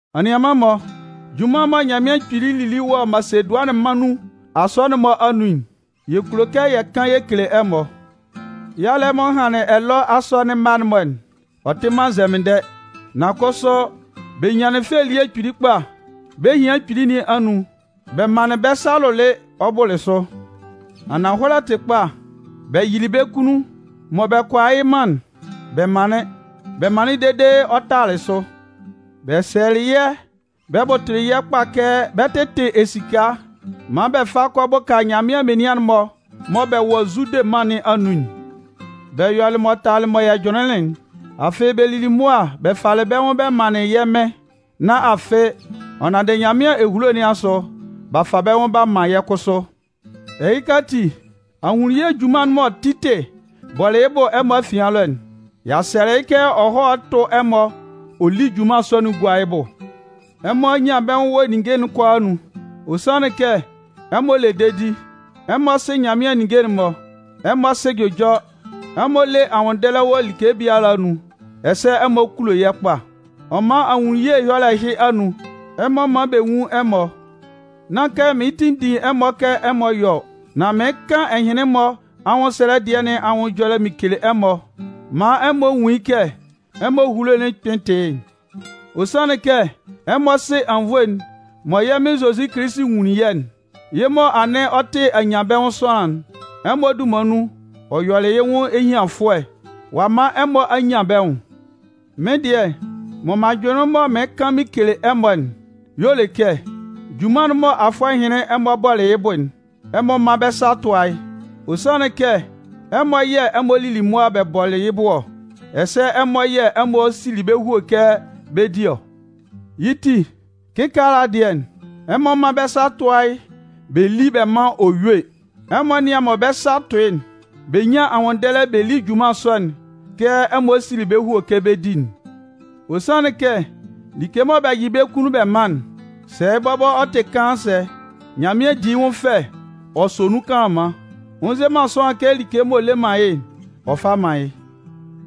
Anianman-mɔ, junman mɔ Nyanmɩan Kpili lili wɔ Masedʋanɩn mân nun asɔnɩn'n-mɔ anun'n, yɛ kulo kɛ yɛ kan yɛ kele ɛmɔ. Yalɛ m'ɔ hanlɩn ɛlɔ asɔnɩn mma'n-mɔ'n, ɔ tɩ man nzɛmɩndɛ. Nan kʋsʋ bɛ nyanlɩn fɛ elie kpili kpa bɛ́ ehian kpili nɩn anun, bɛ manlɩn bɛ́ sa lʋlɩ ɔ bʋlɩ sʋ. Ananhɔlɛ tɩ kpa, bɛ yɩlɩ bɛ́ kunnun, mɔ bɛ kʋala yɩ́ man'n, bɛ manlɩn. Bɛ manlɩn dede ɔ talalɩ sʋ. Bɛ sɛlɛlɩ yɛ́ bɛ bʋtʋlɩ yɛ́ kpa kɛ bɛ 'tɩtɩ esika maan bɛ fa kɔ bʋka Nyanmɩan menian'n-mɔ mɔ bɛ wɔ Zude mân nɩn anun'n. Bɛ yɔlɩ m'ɔ tala mɔ yɛ jʋnlɩnlɩn'n. Afɩ, bɛ lili mʋa bɛ falɩ bɛ́ nwʋn bɛ manlɩn yɛ́ Mɩn. Nan afɩ, ɔ nanndɩ Nyanmɩan ehulo nɩn asʋ, b'a fa bɛ́ nwʋn b'a man yɛ́ kʋsʋ. Ɛhɩka ati, ahunnunye junman'n mɔ Titɩ bɔlɩ yɩ́ bʋ ɛmɔ afian ɛlɔ'n, y'a sɛlɛ yɩ́ kɛ ɔ hɔ́ tʋ́ ɛmɔ ɔ lí junman sɔ'n gúa yɩ́ bʋ. Ɛmɔ a nyan bɛ́ nwʋn wɔ ninnge'n kʋalaa anun. Ɔ sanlɩn kɛ ɛmɔ le dedi, ɛmɔ sɩ Nyanmɩan ninnge'n-mɔ, ɛmɔ sɩ jʋjɔ, ɛmɔ le anwʋnndɛlɛ wɔ like biala anun, ɛsɛ ɛmɔ kulo yɛ́ kpa. Ɔ man ahunnunye ɛyɔlɛ ɛhɩ anun, ɛmɔ mán bɛ nwún ɛmɔ. Nán kɛ mɩɩn tinndin ɛmɔ kɛ ɛmɔ yɔ́ ɔ. Nan mɩɩn kan ɛhɩnlɩn-mɔ anwʋnndɛlɛ dɩɛ nɩn anwʋn ɛjɔlɛ mɩn kele ɛmɔ maan ɛmɔ nwun yɩ́ kɛ ɛmɔ ehulo'n kpɩn tɩ yɩ́'n. Ɔ sanlɩn kɛ ɛmɔ sɩ anwunnvoe'n mɔ yɛ́ Mɩn Zozi Kilisi nwunlin yɛ́'n. Yɩ́ mɔ anɩn ɔ tɩ anyanbɛnwʋn sʋanlan'n, ɛmɔ dunman nun, ɔ yɔlɩ yɩ́ nwʋn ehianfʋɛ ɔ'a man ɛmɔ a nyan bɛ́ nwʋn. Mɩ́n dɩɛ mɔ m'an jʋnlɩn mɔ mɩɩn kan mɩn kele ɛmɔ'n y'ɔ le kɛ, junman'n mɔ afʋɛ ɛhɩnlɩn ɛmɔ bɔlɩ yɩ́ bʋ'n, ɛmɔ mán bɛ́ sa tʋ́a yɩ́. Ɔ sanlɩn kɛ ɛmɔ yɛ̂ ɛmɔ lili mʋa bɛ bɔlɩ yɩ́ bʋ ɔ, ɛsɛ ɛmɔ yɛ̂ ɛmɔ sili bɛ́ hue kɛ bɛ 'di ɔ. Yɩ́ ti, kɩkaala dɩɛ, ɛmɔ mán bɛ́ sa tʋ́a yɩ́ bɛ lí bɛ mán ɔ yúe. Ɛmɔ nían mɔ bɛ́ sa tʋ'n, bɛ nyán anwʋnndɛlɛ bɛ lí junman sɔ'n kɛ ɛmɔ sili bɛ́ hue kɛ bɛ 'di'n. Ɔ sanlɩn kɛ like mɔ bɛ yɩ bɛ́ kunnun bɛ man'n, sɛ bɔbɔ ɔ tɩ kaan sɛ, Nyanmɩan di yɩ́ nwʋn fɛ ɔ sɔ nun kanlanman. Ɔ nze man sʋanlan kɛ like m'ɔ le man yɩ́'n, ɔ fá mán yɩ́.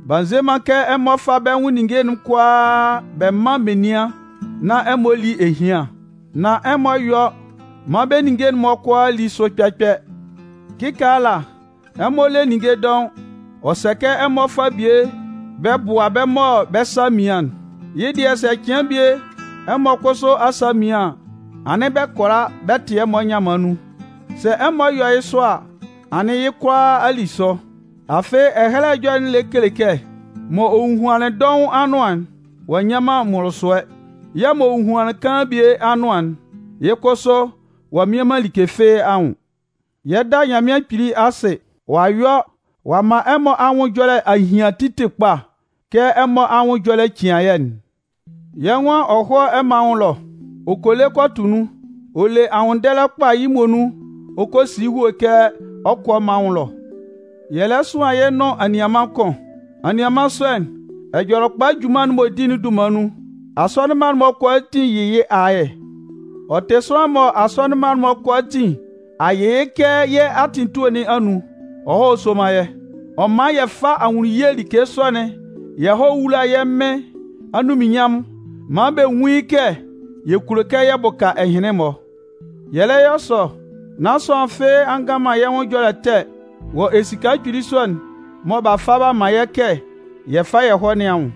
B'a nze man kɛ ɛmɔ fá bɛ́ nwʋn ninnge'n-mɔ kʋalaa bɛ mán menian nán ɛmɔ lí ehian, nan ɛmɔ yɔ́ maan bɛ́ ninnge'n-mɔ kʋalaa lí sʋ kpɛ-kpɛ. Kɩkaala ɛmɔ le ninnge dɔʋn, ɔ sɛ kɛ ɛmɔ fá bie bɛ bʋ́a bɛ́ mɔ bɛ́ sa a mian'n. Yɩ́ dɩɛ, sɛ cɩan bie ɛmɔ kʋsʋ asa mian an, anɩn bɛ kʋala bɛ tɩ ɛmɔ nyanman nun. Sɛ ɛmɔ yɔ yɩ́ sɔ a, anɩn yɩ́ kʋalaa a li sʋ. Afɩ, Ɛhɛlɛ Ɛjɔlɛ'n lɛ kele kɛ: M'ɔ hohuanlɩn dɔʋn anʋan'n, ɔ'a nnyan man mʋlʋsʋɛ, yɛ̂ m'ɔ hohuanlɩn kaan bie anʋan'n, yɩ́ kʋsʋ ɔ mmian man like fɩ́ɩ́ anwʋn. Yɛ 'da Nyanmɩan Kpili asɩ. Ɔ'a yɔ ɔ'a man ɛmɔ anwʋn ɛjɔlɛ a hian Titɩ kpa kɛ ɛmɔ anwʋn ɛjɔlɛ cian yɛ́'n. Yɛ́ nwan ɔ hɔ́ ɛmɔ anwʋn ɛlɔ. Ɔ kɔ le kɔ tʋ nun. Ɔ le anwʋnndɛlɛ kpa yɩ́ muonun ɔ kɔ si yɩ́ hue kɛ ɔ 'kɔ ɛmɔ anwʋn ɛlɔ. Yɛ lɛ sʋan yɩ́ nʋn anianman kʋn. Anianman sɔ'n, Ɛjɔlɛkpa junman'n m'ɔ di'n dunman nun, asɔnɩn mma'n-mɔ kʋalaatin yɩ yɩ́ ayɛ. Ɔ tɩ sʋanlan mɔ asɔnɩn'n-mɔ kʋalaatin a yɩ yɩ́ kɛ yɛ́ atɩn etue nɩn anun, ɔ hɔ́ sóman yɛ́. Ɔ mán yɛ fá ahunnunye like sɔ'n yɛ hɔ́ wúla yɛ́ Mɩn anunminnyanmʋn maan bɛ nwún yɩ́ kɛ yɛ kulo kɛ yɛ bʋka ɛhɩnlɩn-mɔ. Yɛ lɛ yɔ sɔ, nán sʋanlan fɩ́ɩ́ a ngan man yɛ́ nwʋn ɛjɔlɛ ɛtɛ wɔ esika kpili sɔ'n mɔ b'a fa b'a man yɛ́ kɛ yɛ fá yɛ hɔ́ nɩn anwʋn.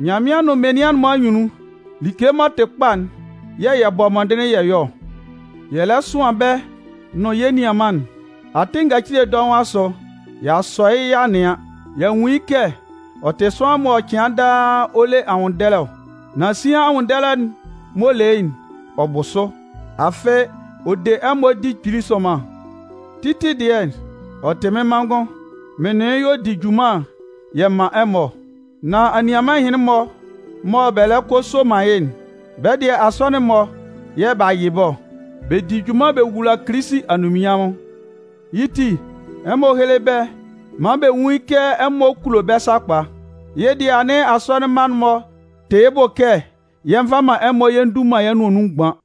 Nyanmɩan nʋn menian'n-mɔ anyunnun, like m'ɔ tɩ kpa'n yɛ̂ yɛ bɔ mɔndɩnlɩn yɛ yɔ ɔ. Yɛ lɛ sʋan bɛ́ nʋn yɛ́ nianman'n. Atɩn ngacile dɔʋn asʋ, y'a sɔ yɩ́ y'a nɩan. Y'a nwun yɩ́ kɛ ɔ tɩ sʋanlan mɔ cɩan daa ɔ le anwʋnndɛlɛ ɔ. Nan sian anwʋnndɛlɛ'n m'ɔ le yɩ́'n, ɔ bʋ sʋ. Afɩ, ɔ de ɛmɔ di kpili sʋnman. Titɩ dɩɛ, ɔ tɩ mɩ́n manngʋn. Mɩn nʋn yɩ́ y'ɔ di junman yɛ man ɛmɔ ɔ. Nan anianman ɛhɩnlɩn-mɔ mɔ bɛ lɛ kɔ a soman yɩ́'n, bɛ́ dɩɛ asɔnɩn'n-mɔ yɛ̂ b'a yɩ bɛ́ ɔ. Bɛ di junman bɛ wula Kilisi anunminnyanmʋn. Yɩ́ ti, ɛmɔ héle bɛ́ maan bɛ nwún yɩ́ kɛ ɛmɔ kulo bɛ́ sakpa. Yɩ́ dɩɛ anɩn asɔnɩn mma'n-mɔ tɩ yɩ́ bʋ kɛ yɛ nva man ɛmɔ yɛ ndu man yɛ́ nʋan nun mgban.